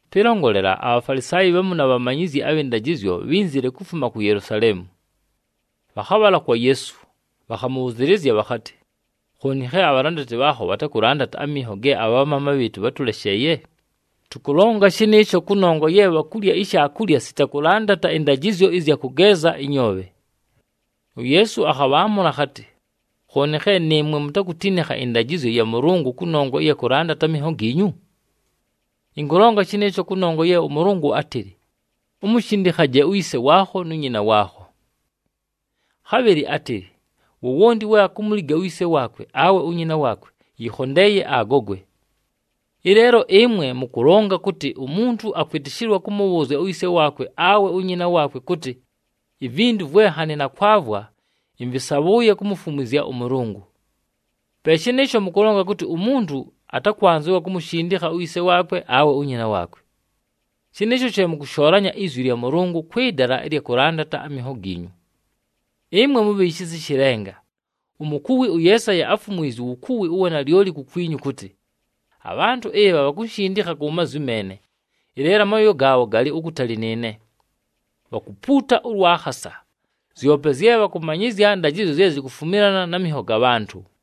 Pɨlongolela, aBhafalisaayi bhamu na bhamanyizyi abhɨ ndajɨzyo bhínzile kufuma ku Yelusaleemu. Bhakhabhala kwa Yeesu, bhakhamʉbhʉzɨɨlɨzya bhakhatɨ, “Khooni khe abhalandati bhaakho bhatakʉlandata aminho ge abhamaama bhɨɨtʉ bhátʉlesheeye? Tʉkʉlonga shɨnɨɨsho kʉnongwa ye bhakulya ishaakulya sita kʉlandata ɨndajɨzyo ɨzya kʉgeeza ɨnyoobhe!” UYeesu akhabhaamʉla akhatɨ, “Khooni khe nɨɨmwe mutakutinikha ɨndajɨzyo ya Mʉlʉngʉ kʉnongwa ɨya kʉlandata aminho giinyu? Ɨnkʉlonga shɨnɨɨsho kʉnongwa ye ʉMʉlʉngʉ átɨlɨ, ‘Umushindikhaje uyise waakho nu nyina waakho.’ Khabhɨlɨ átɨlɨ, ‘Wowonti we akumuliga uyise waakwe awe unyina waakwe, yɨkhondeeye agogwe.’ Ɨleelo ɨmwe mʉkʉlonga kʉtɨ umuntu akwɨtɨshɨlwa kʉmʉbhʉʉzya uyise waakwe awe unyina waakwe kʉtɨ, ‘Ivintu vwe nhanɨ nakwavwa, ɨmvɨsabhʉʉye kumufumwizya ʉMʉlʉngʉ.’ Pe shɨnɨɨsho, mʉkʉlonga kʉtɨ umuntu atakwanzɨwa kumushindikha uyise waakwe awe unyina waakwe. Shɨnɨɨsho she mʉkʉshoolanya izwi lya Mʉlʉngʉ kwɨ dala ɨlya kʉlandata aminho giinyu. Ɨmwe mubhi shisa ɨshɨ lenga! Umukuwi ʉYeesaya áfumwizye uwukuwi ʉwa nalyoli kukwinyu kʉtɨ, ‘Abhantʉ ɨbha bhakunshindikha ku mazwi meene, ɨleelo amooyo gaabho galɨ ukutali nɨɨne. Bhakumpuuta ʉlwa khasa. Zyope zye bhakʉmanyɨzya ndajɨzyo zye zikufumilana na minho ga bhantʉ.’”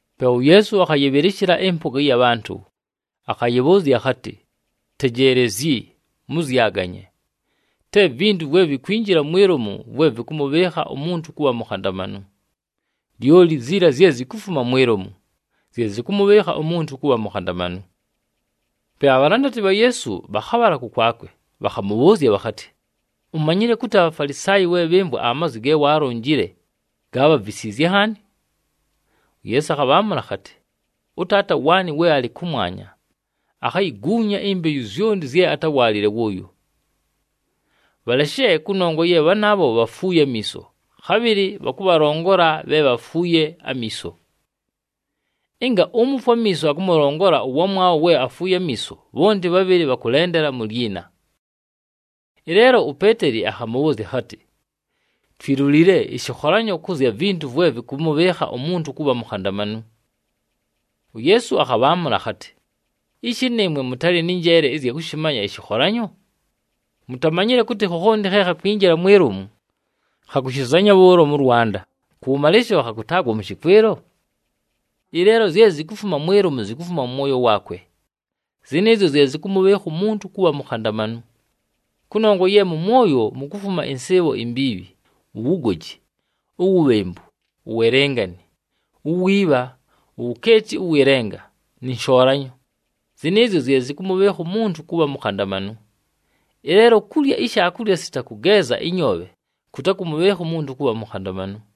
Pe uYeesu akhayɨbhɨlɨshɨla ɨmpʉga ɨya bhantʉ, akhayɨbhʉʉzya akhatɨ, “Tejeelezyi, mʉzyaganye! Te vintu vwe vikwinjila mwi lomu, vwe vɨkʉmʉbhɨɨkha umuntu kʉbha mukhandamanu. Lyoli ziila zye zikufuma mwi lomu, zye zɨkʉmʉbhɨɨkha umuntu kʉbha mukhandamanu.” Pe abhalandati bha Yeesu bhakhabhala kʉkwakwe, bhakhamʉbhʉʉzya bhakhatɨ, “Umanyile kʉtɨ aBhafalisaayi we bhɨmvwa amazwi ge waalonjile, gaabhavisiizye nhaani?” UYeesu akhabhaamʉla akhatɨ, “ɄTaata waanɨ we alɨ kʉmwanya akhayiguunya imbeyu zyonti zye atáwaalile wʉʉyo. Bhaleshe, kʉnongwa ye bhanaabho bhafuuye amiiso, khabhɨlɨ bhakʉbhalongola bhe bhafuuye amiiso! Ɨnga umufwe amiiso akʉmʉlongola ʉwamwabho we afuuye amiiso, bhonti bhabhɨlɨ bhakʉlendela mu lyina!” Ɨleelo uPeeteli akhamʉbhʉʉzya akhatɨ, “Twilulile ɨshɨkholanyo kʉ zya vintu vwe vɨkʉmʉbhɨɨkha umuntu kʉbha mukhandamanu.” UYeesu akhabhaamʉla akhatɨ, “Ishi nɨɨmwe mʉtalɨ nɨ njeele ɨzya kʉshɨmanya ɨshɨkholanyo? Mutamanyile kʉtɨ khokhonti khe khakwinjila mwi lomu, khakushizanya bhʉʉlo mʉ lwanda, kʉwʉmalɨlɨshɨlo khakʉtaagwa mʉ shɨkwɨlo? Ɨleelo zye zikufuma mwi lomu, zikufuma mʉ mwoyo waakwe. Zɨnɨɨzyo zye zɨkʉmʉbhɨɨkha umuntu kʉbha mukhandamanu. Kʉnongwa ye mʉ mwoyo, mukufuma ɨnsɨɨbho imbiibhi, uwugoji, uwubhembu, uwelengani, uwiibha, uwukeeti ʉwɨ lenga nɨ nshoolanyo. Zɨnɨɨzyo zye zɨkʉmʉbhɨɨkha umuntu kʉbha mukhandamanu. Ɨleelo kulya ishaakulya sita kʉgeeza ɨnyoobhe kʉtakʉmʉbhɨɨkha umuntu kʉbha mukhandamanu.”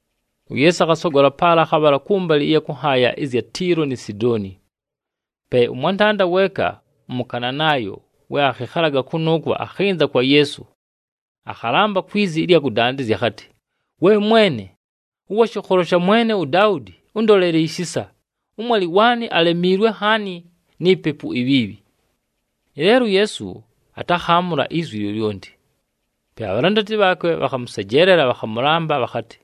UYeesu akhasogola paala, akhabhala kʉmbalɨ ɨya kʉ nhaaya ɨzya Tiilo ni Sidooni. Pe ʉmwantanda weeka ʉMʉkananaayo we akhɨkhalaga kʉnʉʉkwo, akhɨnza kwa Yeesu, akhalamba kwi zi ɨlya kʉdandɨzya akhatɨ, “We Mwene, ʉwa shɨkholo sha mwene uDaudi ʉndolele ishisa! Ʉmwalɨ waanɨ alemiilwe nhaani ni pepu ibhiibhi.” Ɨleelo uYeesu atakhaamʉla izwi lyolyonti. Pe abhalandati bhaakwe bhakhamʉsejeelela, bhakhamʉlamba bhakhatɨ,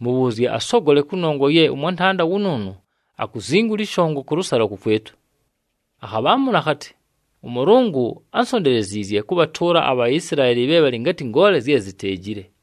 “Mʉbhʉʉzye asogole, kʉnongwa ye ʉmwantanda wʉnʉʉnʉ akuzingula ɨshongo kʉlʉsalo kʉkwɨtʉ.” Akhabhaamʉla akhatɨ, “ɄMʉlʉngʉ ánsonteleziizye kʉbhatʉʉla aBhaisilaeli bhe bhalɨ ngatɨ ngoole zye ziteejile.”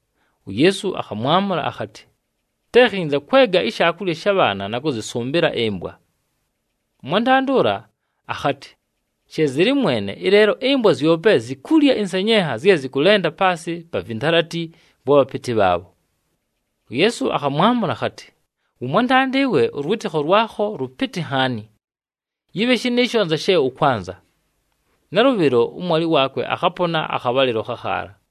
UYeesu akhamwamʉla akhatɨ, “Te khinza kwega ishaakulya sha bhaana na kʉzɨsʉmbɨla ɨmbwa.” Ʉmwantanda ʉla akhatɨ, “She zɨlɨ Mwene, ɨleelo ɨmbwa zyope zikulya ɨnsenyenha zye zɨkʉlenda paasɨ pa vintalati vwa bhapɨtɨ bhaabho.” UYeesu akhamwamʉla akhatɨ, “Wʉmwantanda ɨwe, ʉlwɨtɨkho lwakho lʉpɨtɨ nhaani! Yɨbhe shɨnɨɨsho anza she ʉkwanza.” Nalʉbhɨlo, ʉmwalɨ waakwe akhapona akhabhalɨlo khakhaala.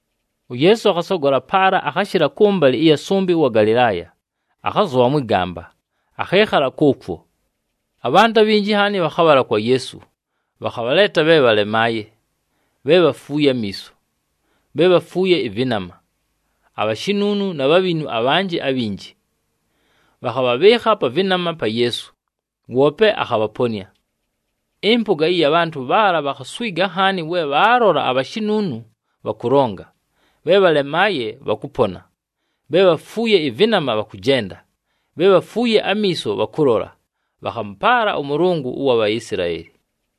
UYeesu akhasogola paala akhashɨla kʉmbalɨ ɨya sʉmbɨ ʉwa Galɨlaaya, akhazʉbha mwɨ gamba, akhɨɨkhala kʉʉkwo. Abhantʉ abhinji nhaani bhakhabhala kwa Yeesu, bhakhabhaleeta bhe bhalemaaye, bhe bhafuuye amiiso, bhe bhafuuye ɨvɨnama, abhashinuunu na bhabhinu abhanjɨ abhinji. Bhakhabhabhɨɨkha pa vɨnama pa Yeesu, woope akhabhaponɨa. Ɨmpʉga ɨya bhantʉ bhaala bhakhaswiga nhaani we bhabhalola abhashinuunu bhakʉlonga, bhe bhalemaaye bhakʉpona, bhe bhafuuye ɨvɨnama bhakʉjenda, bhe bhafuuye amiiso bhakʉlola. Bhakhamʉpaala ʉMʉlʉngʉ ʉwa Bhaisilaeli.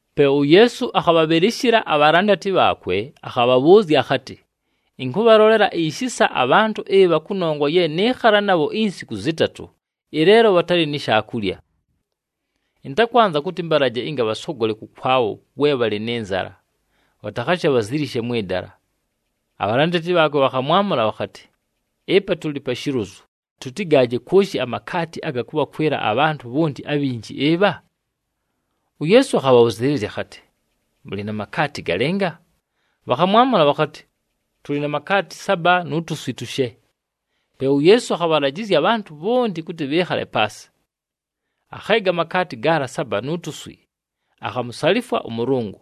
Pe uYeesu akhabhabhɨlɨshɨla abhalandati bhaakwe, akhabhabhʉʉzya akhatɨ, “Ɨnkʉbhalolela ishisa abhantʉ ɨbha kʉnongwa ye nɨɨkhala nabho insiku zɨtatʉ, ɨleelo bhatalɨ ni shaakulya. Ɨntakwanza kʉtɨ ɨmbalaje ɨnga bhasogole kʉkwabho we bhalɨ nɨ nzala, bhatakhashe bhazilishe mwɨ dala.” Abhalandati bhaakwe bhakhamwamʉla bhakhatɨ, “Ɨpa tʉlɨ pa shilozu, tʉtɨgaaje kwoshi amakaati aga kʉbhakwɨla abhantʉ bhonti abhinji ɨbha?” UYeesu akhabhabhʉzɨɨlɨzya akhatɨ, “Mʉlɨ na makaati galɨnga?” Bhakhamwamʉla bhakhatɨ, “Tʉlɨ na makaati saba nu tuswi tushe.” Pe uYeesu akhabhalajɨzya abhantʉ bhonti kʉtɨ bhɨɨkhale paasɨ. Akheega amakaati gaala saba nu tuswi, akhamusalifwa ʉMʉlʉngʉ,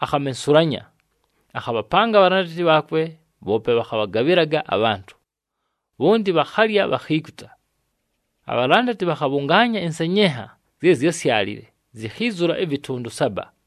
akhamensulanya, akhabhapanga abhalandati bhaakwe, bhoope bhakhabhagabhɨlaga abhantʉ. Bhonti bhakhalya, bhakhiikuta. Abhalandati bhakhabhʉngaanya ɨnsenyenha zye zyásyalile, zikhiizula ɨvɨtʉndʉ saba.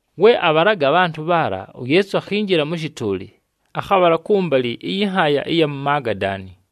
We abhalaga abhantʉ bhaala, uYeesu akhinjila mʉ shɨtʉʉlɨ, akhabhala kʉmbalɨ ɨyɨ nhaaya ɨya mu Magadaani.